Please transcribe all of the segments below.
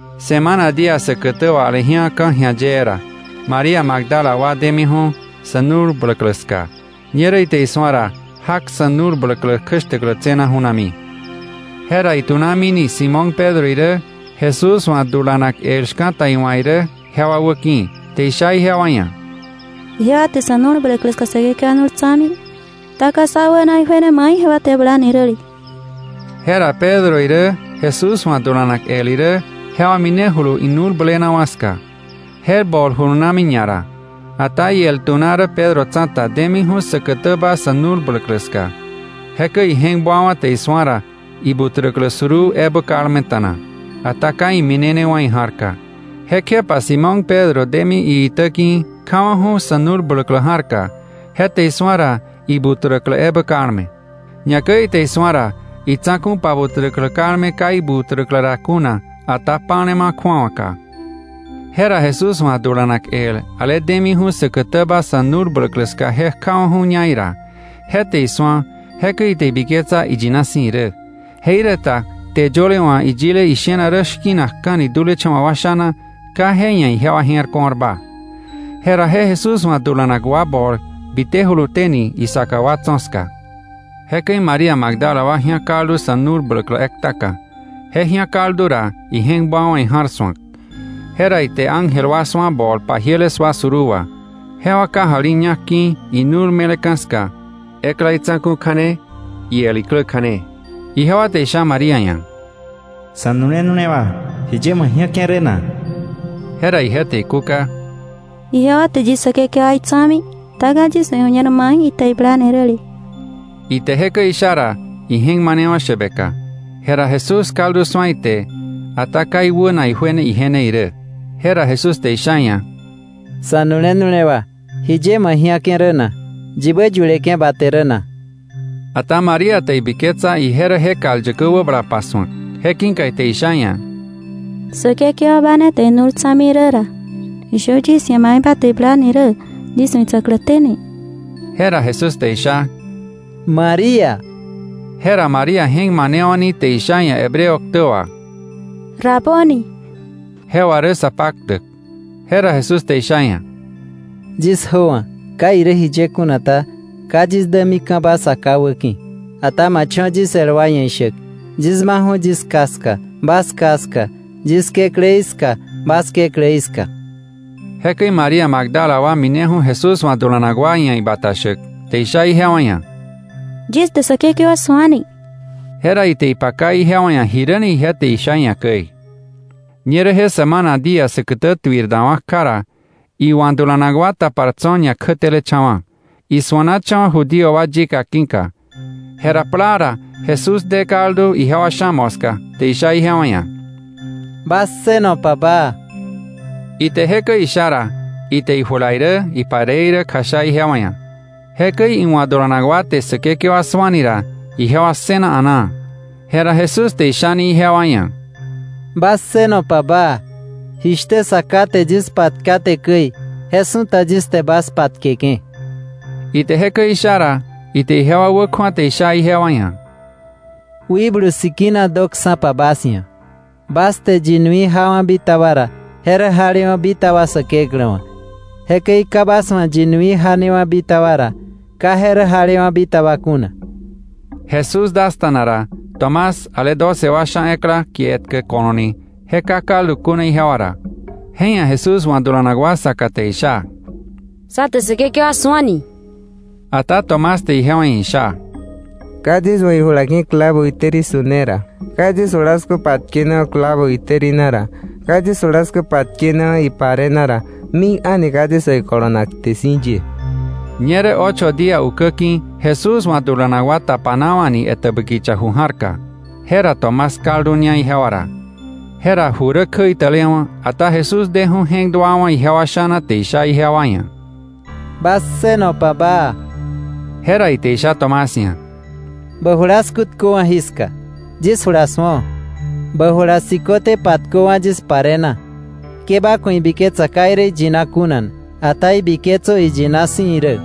Semana día säkätä wà aleji̱a ka̱ ji̱a yee ra, María Magdala wa demiju̱ sa̱ nu̱l bläklä ska. Ñerä ite isu̱a ra, jak sa̱ nu̱l bläklä kjäshtäklä tse̱na ju̱nami. Jera itu̱namini Simón Pedro irä Jesús wa̱ dulanak el shka̱ta iwa̱ irä jewa wäki̱, te isha ijewa ia̱: —Ijewa te sa̱ nu̱l bläklä ska Säkekewa nu̱l tsa̱mi, ata ka sä wäna ijuene mai ijewa te iblani räle. Jera Pedro irä Jesús wa̱ dulanak el irä jewa minejulu inu̱l blenawa̱ ska. Je bol julunami ñara. Ata iel tu̱na rä Pedro tsa̱ta, demi säkätäba sa̱ nu̱l bläklä ska. Jekäi ije̱k buawa̱ te isu̱a ra ibuträklä suruu ebä kalmeta̱na. Ata ka iminenewa̱ ija̱rka. Jekjepa Simón Pedro demi iitä ki̱, kjawa̱ju̱ sa̱ nu̱l bläklä ja̱rka. Je te isu̱a ra, ibuträklä ebä kalme. Ñakäi ite isu̱a ra, itsa̱ku̱ pabuträklä kalme ka ibuträklä ra kuna, ata pa̱lema kju̱awaka. Jera Jesús wa̱ dulanak el ale demiju̱ säkätäba sa̱ nu̱l bläklä ska je kjawa̱ju̱ña ira. Je te isu̱a, jekäi ite ibiketsa iyina si̱ irä. Jeiräta kte yöle wa̱ iyile ishena rä shki̱nakka̱ni dulecha̱wa̱ wa sha̱na, ka je ia̱ ijewa je̱r ko̱rba. Jera je Jesús wa̱ dulanak wa bol bitejuluténi isaka wa tso̱ ska. Jekäi María Magdala wa ji̱á kaldu sa̱ nu̱l bläklä ektaka. Je ji̱á kaldu ra, ije̱k buawa̱ ija̱r su̱ak. Jera ite ángel wa su̱a bol pajiele sua suruu wà. Jewa kajali ñak ki̱ inu̱l me̱leka̱ ska, ekla itsa̱ku̱ kja̱ne, iel iklä kja̱ne. Jewa te isha María ia̱: —Sa̱nu̱le nu̱lewa, ¿jiye ma ji̱ake̱ rä na? Jera ije te ikúka: —Ijewa te yis Säkekewaí tsa̱mi. Ata ka yis wa̱ iju̱ñer mai ite je blani räle. Ite jekäi isha ra, ije̱k manewa̱ shäbeka. Jera Jesús kaldu su̱a ite, ata ka iwäna ijuene ije ne irä. Jera Jesús te isha iia̱: —Sa̱nu̱le nu̱lewa, ¿jiye ma ji̱ake̱ rä na? ¿Yibä yuleke̱ ba te rä na? Ata María te ibiketsa ije rä je kal yäkä wäbala pasu̱ak. Je ki̱ka ite isha iia̱: —Säkekewa, ba ne te inu̱l tsa̱mi rä ra, ishö yis ia̱ mai ba te iblani rä yis wa̱ itsa̱kläténi. Jera Jesús te isha: —¡María! Jera María je̱k manewa̱ni te isha iia̱ Hebreo ktä wà: —¡Raboni! (Je wà rä Sapaktäk.) Jera Jesús te isha iia̱: —Yis jöwa̱. Ka irä jiye kuna ta, ka yis dämika̱ba Sa Ká wäki̱. Ata ma cho̱ yis el wa ia̱ ishäk: “Yis maka̱ju̱ yis Ká ska, bas Ká ska, yis Kekläí ska, bas Kekläí ska.” Jekäi María Magdala wa mineju̱ Jesús wa̱ dulanak wa ia̱ ibata shäk, te isha ijewa ia̱: “Yis te Säkekewa su̱ani.” Jera ite ipaka ijewa ia̱ jiräni ije te isha iia̱ käi. Ñerä je semana día säkätä tuir dawa̱ kja ra, iwa̱ dulanak wa tapar tso̱ ñakjätelecha̱wa̱, isuanacha̱wa̱ Judío wa yika ki̱ka. Jera plaa ra Jesús de kaldu ijewa sha̱ moska, te isha ijewa ia̱: —Bas ssënopa baa. Ite jekäi isha ra, ite ijula irä ipare irä kjasha ijewa ia̱. Jekäi iwa̱ dulanak wa te Säkekewa su̱ani ra, ijewa ssëna a̱naa. Jera Jesús te ishani ijewa ia̱: —Bas ssënopa baa. Jishtä Sa Ká te yis patkaté käi, je su̱ta yis te bas patkeke̱. Ite jekäi isha ra, ite ijewa wäkju̱a te isha ijewa ia̱: —Wikblu Sikina döksa̱pa bas ia̱. Bas te yi nui jawa̱ bitaba ra, je rä jalewa̱ bitaba Säkeklä wa̱. Jekäi ka bas wa̱ yi nui janewa̱ bitaba ra, ka je rä jalewa̱ bitaba kuna. Jesús dasta̱na ra, Tomás ale doce wa sha ekla, kie etkä Ko̱lo̱ ni, je ka kaldu kuna ijewa ra. Je ia̱ Jesús wa̱ dulanak wa saka te isha: —Sá te Säkekewa su̱ani. Ata Tomás te ijewa ia̱ isha: —Ka yis wa̱ ijula ki̱ clavo itäri su̱ne ra, ka yis julasku patkenewa̱ clavo itäri na ra, ka yis julasku patkenewa̱ ipare na ra, mik a̱ni ka yis wa̱ ikolonak kte si̱ ye. Ñerä ocho día ukäki̱ Jesús wa̱ dulanak wa tapanawa̱ni etäbä kicha ju ja̱rka. Jera Tomás kalduña ijewa ra. Jera ju rä kjäitälewa̱, ata Jesús deju̱ je̱k duawa̱ ijewa sha̱na te isha ijewa ia̱: —Bas ssënopa baa. Jera ite isha Tomás ia̱: —Bä julasku tköwa̱ jiska; yis jula su̱o. Bä jula siköte patköwa̱ yis pare na. Ke ba ku̱ ibiketsa ka irä iyina kuna, ata ibiketsö iyina si̱ irä.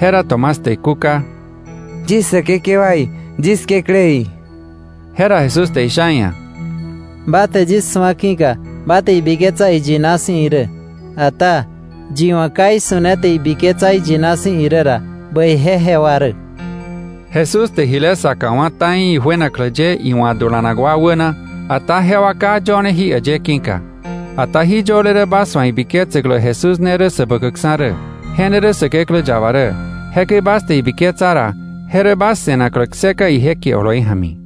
Jera Tomás te ikúka: —¡Yis Säkekewaí, yis Kekläí! Jera Jesús te isha iia̱: —Ba te yis su̱a ki̱ka ba te ibiketsa iyina si̱ irä. Ata, ¡yi wa̱ ka isu̱ne te ibiketsa iyina si̱ irä ra bäije jewa rä! Jesús te jile saka wá̱ ta̱i ijuenaklä ye iwa̱ dulanak wa wäna, ata jewa ka yöne jí äyë ki̱ka. Ata jí yöle rä bas wa̱ ibiketsäklä Jesús ne rä Säbäkäkksa̱ rä, je ne rä Säkeklä yaba rä, jekäi bas te ibiketsa ra, je rä bas se̱naklä kseka ije kie oloi ja̱mi.